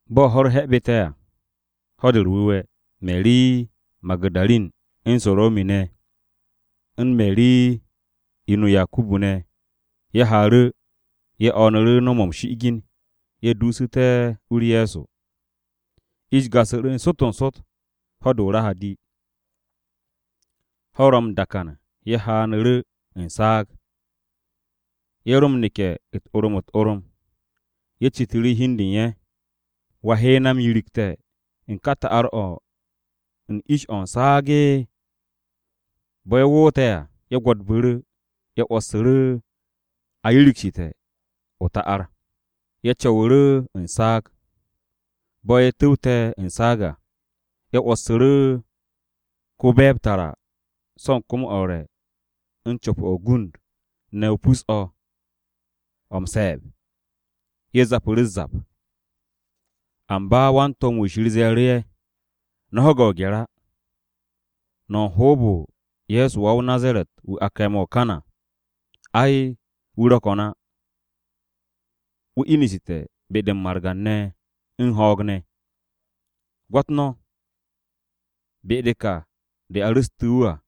Bo̱ ho̱-u̱r he̱bu̱te̱ à, Ho̱-de u̱r-Wu̱we̱, Meri Magu̱darin, u̱n Sarome̱ ne̱, u̱n Meri (inu Yakubu) ne̱, ye̱ haaru̱, ye̱ o̱o̱nu̱ru̱ no̱w-mo̱ m-shi'igin ye̱ duusu̱te̱ u-u̱r Ye̱so. Ish gasu̱ru̱ n-sot n-sot, ho̱-de o-Rahadi, ho̱-u̱r ro̱ m-dakan ye̱ haanu̱ru̱ u̱n saag. Ye̱ ro m-neke̱ u̱t-orom u̱t-orom. Ye̱ citu̱ru̱ hi u̱n de u̱n ye̱, “¿Wa he na m-yirikte̱ u̱n ka ta'ar-o̱ u̱n ish-o̱ u̱n saag?” Bo̱ ye̱ woote̱ à, ye̱ gwo̱dbu̱ru̱, ye̱ 'wo̱ssu̱ru̱ a yirigsu̱te̱ o-ta'ar. Ye̱ co̱wu̱ru̱ u̱n saag. Bo̱ ye̱ tu̱wte̱ u̱n saag à, ye̱ 'wo̱ssu̱ru̱ ko-be̱e̱b tara so̱ u̱n kom-o a re̱ u̱n co̱p-o̱ o-gund ne̱ o pus-o̱, o̱ m-se̱e̱b. Ye̱ zapu̱ru̱ u̱s-zap. Amba wan-to̱m-wu̱ Shir ze̱e̱ru̱ ye̱, “No̱ ho̱ge̱ o-gye̱r á. No̱ u̱n hoob-o Ye̱so wa-o-Nazaret-wu̱ a kame̱ o-kan à. Ai, wu̱ ro̱ ko̱n á. Wu̱ inu̱te̱ be-de m-margan ne̱ u̱n ho̱o̱g ne̱. Gwo̱t no̱, be-de ka de a ru̱stu̱ wu̱ à.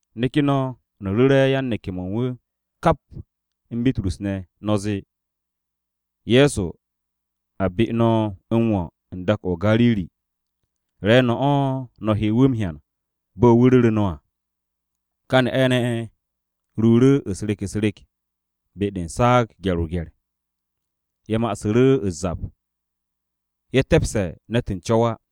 Neke̱ no̱, no̱ ru̱re̱ yan-neke̱-mo̱ u̱n wu̱ kap u̱n Bitrus ne̱. No̱ zee, ‘Ye̱so a be no̱ m-wo̱ u̱n dak-o̱ o-Gariri. Re̱e̱no̱ o̱ no̱ he wu̱ m-hyan bo̱ wu̱ ru̱re̱ no̱ à.’” Ka ne'a-ne̱ ye̱ ruuru̱ u̱s-rek u̱s-rek be-de u̱n saag gye̱r-o-gye̱r. Ye̱ ma'asu̱ru̱ u̱s-zap. Ye̱ te̱pse̱ ne̱t u̱n co̱w á.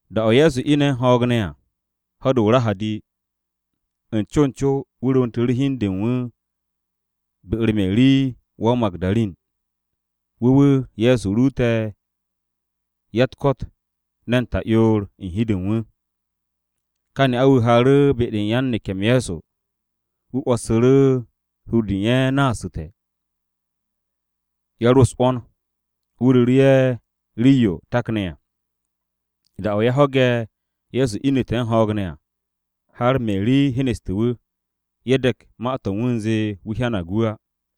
Da-o̱ Ye̱so ine̱ u̱n ho̱o̱g ne̱ à, ho̱-de o-Rahadi, u̱n co u̱n co wu̱ rwu̱ntu̱ru̱ hi u̱n de u̱n wu̱ be-u̱r Meri wa-o-Magu̱darin. Wu̱ wu̱ Ye̱so ruute̱ ya-u̱t-ko̱t ne̱n ta'yoor u̱n hi-de u̱n wu̱. Ka ne'a-wu̱ haaru̱ be-de u̱n yan-neke̱-m Ye̱so. Wu̱ 'wo̱ssu̱ru̱ hur-de u̱n ye̱ naasu̱te̱. Ye̱ ro u̱s-'wo̱n. Wu̱ ru̱ru̱ ye̱ rii-yo takne̱ à. Da-o̱ ye̱ ho̱ge̱ Ye̱so inu̱te̱ u̱n ho̱o̱g ne̱ à, har Meri hyeneste̱ wu̱, ye̱ de̱k ma-to̱ u̱n wu̱ u̱nze wu̱ hyanag wu̱ á.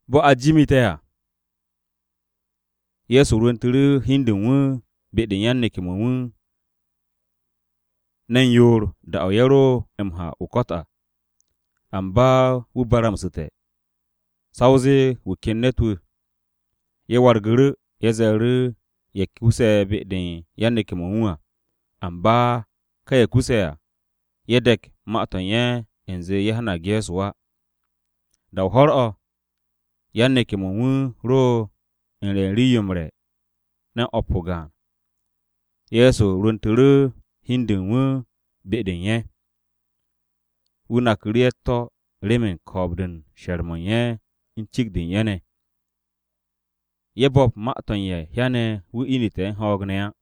Bo̱ a jimite̱ à, Ye̱so rwu̱ntu̱ru̱ hi u̱n de u̱n wu̱ be-de u̱n yan-neke̱-mo̱ u̱n wu̱ ne̱n yoor da-o̱ ye̱ ro m-ha o-ko̱t à. Amba wu̱ baramsu̱te̱, sa o zee wu̱ ken ne̱t-wu̱. Ye̱ wargu̱ru̱, ye̱ ru̱ru̱ ye̱ kuse̱ be-de u̱n yan-neke̱-mo̱ u̱n wu̱ à, amba ka ye̱ kuse̱ à ye̱ de̱k ma-to̱ u̱n ye̱ u̱nze ye̱ hyanag Ye̱so á. Da-o ho̱r-o̱, yan-neke̱-mo̱ u̱n wu̱ ro u̱n re̱ u̱n rii-yo m-re̱, ne̱n o̱p o-gaan. Ye̱so rwu̱ntu̱ru̱ hi u̱n de u̱n wu̱ be-de u̱n ye̱. Wu̱ naku̱ru̱ ye̱ u̱t-to̱ remen ko̱o̱b-de u̱n she̱r-mo̱ u̱n ye̱ u̱n cikt-de u̱n ye̱ ne̱. Ye̱ bo̱p ma-to̱ u̱n ye̱ hyane̱ wu̱ inu̱te̱ u̱n ho̱o̱g ne̱ á.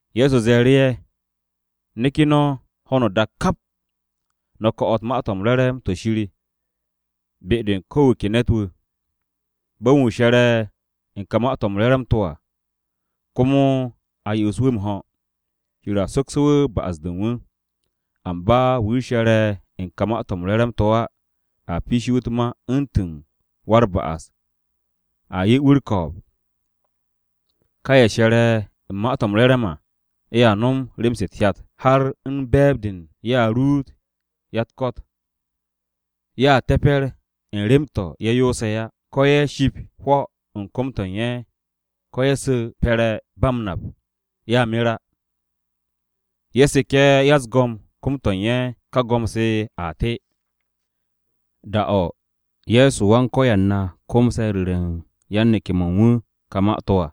Ye̱so ze̱e̱ru̱ ye̱, “Neke̱ no̱ ho̱no o-dak kap, no̱ ko̱'o̱t Ma-to̱ m-Re̱re̱m to̱ Shir be-de u̱n ko̱ wu̱ ke ne̱t-wu̱. Bo̱ u̱n wu̱ she̱re̱ u̱n ka Ma-to̱ m-Re̱re̱m to̱ à, komo a yo'os wu̱ m-ho̱, Shir a sokse̱ wu̱ ba'as-to̱ u̱n wu̱. Amba wu̱ she̱re̱ u̱n ka Ma-to̱ m-Re̱re̱m to̱ á a piishe̱ wu̱ u̱t-ma u̱ntu̱n wa-u̱r-ba'as a 'ye wu̱ u̱r-ko̱o̱b. Ka ye̱ she̱re̱ u̱n Ma-u̱t re to̱ m-Re̱re̱m à, ye̱a nom rem-se u̱t-hyat. Har u̱n be̱e̱b u̱n de, ye̱a ruut ya-u̱t-ko̱t. Ye̱a te̱pe̱r u̱n rem-to̱ ye̱ yoose̱ á. Ko̱ ye̱ ship hwo̱ u̱n kom-to̱ u̱n ye̱, ko̱ ye̱ su̱ pe̱re̱ ba m-nap, ye̱a mer á. Ye̱ seke̱ ya-u̱s-go̱m kom-to̱ u̱n ye̱, ka go̱m-se a te.” Da-o̱ Ye̱so Wan-Ko̱yan na komse̱ ru̱re̱ u̱n yan-neke̱-mo̱ u̱n wu̱ ka ma-to̱ à,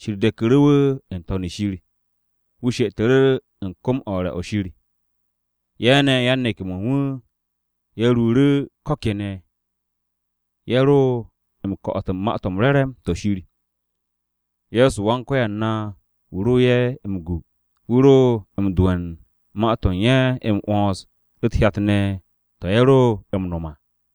Shir de̱ku̱ru̱ wu̱ n-To̱n shir. Wu̱ she'etu̱ru̱ u̱n kom-o a re̱-o̱ Shir. Ye̱ ne̱ yan-neke̱-mo̱ u̱n wu̱, ye̱ ruuru̱ ko̱ kene̱ ye̱ ro m-ko̱'o̱t u̱n Ma-to̱ m-Re̱re̱m to̱ Shir. Ye̱so Wan-Ko̱yan na wu̱ ro ye̱ m-gu. Wu̱ ro m-do'e̱ u̱n ma-to̱ u̱n ye̱ m-'wo̱ns u̱t-hyat ne̱ to̱ ye̱ ro m-no̱m à.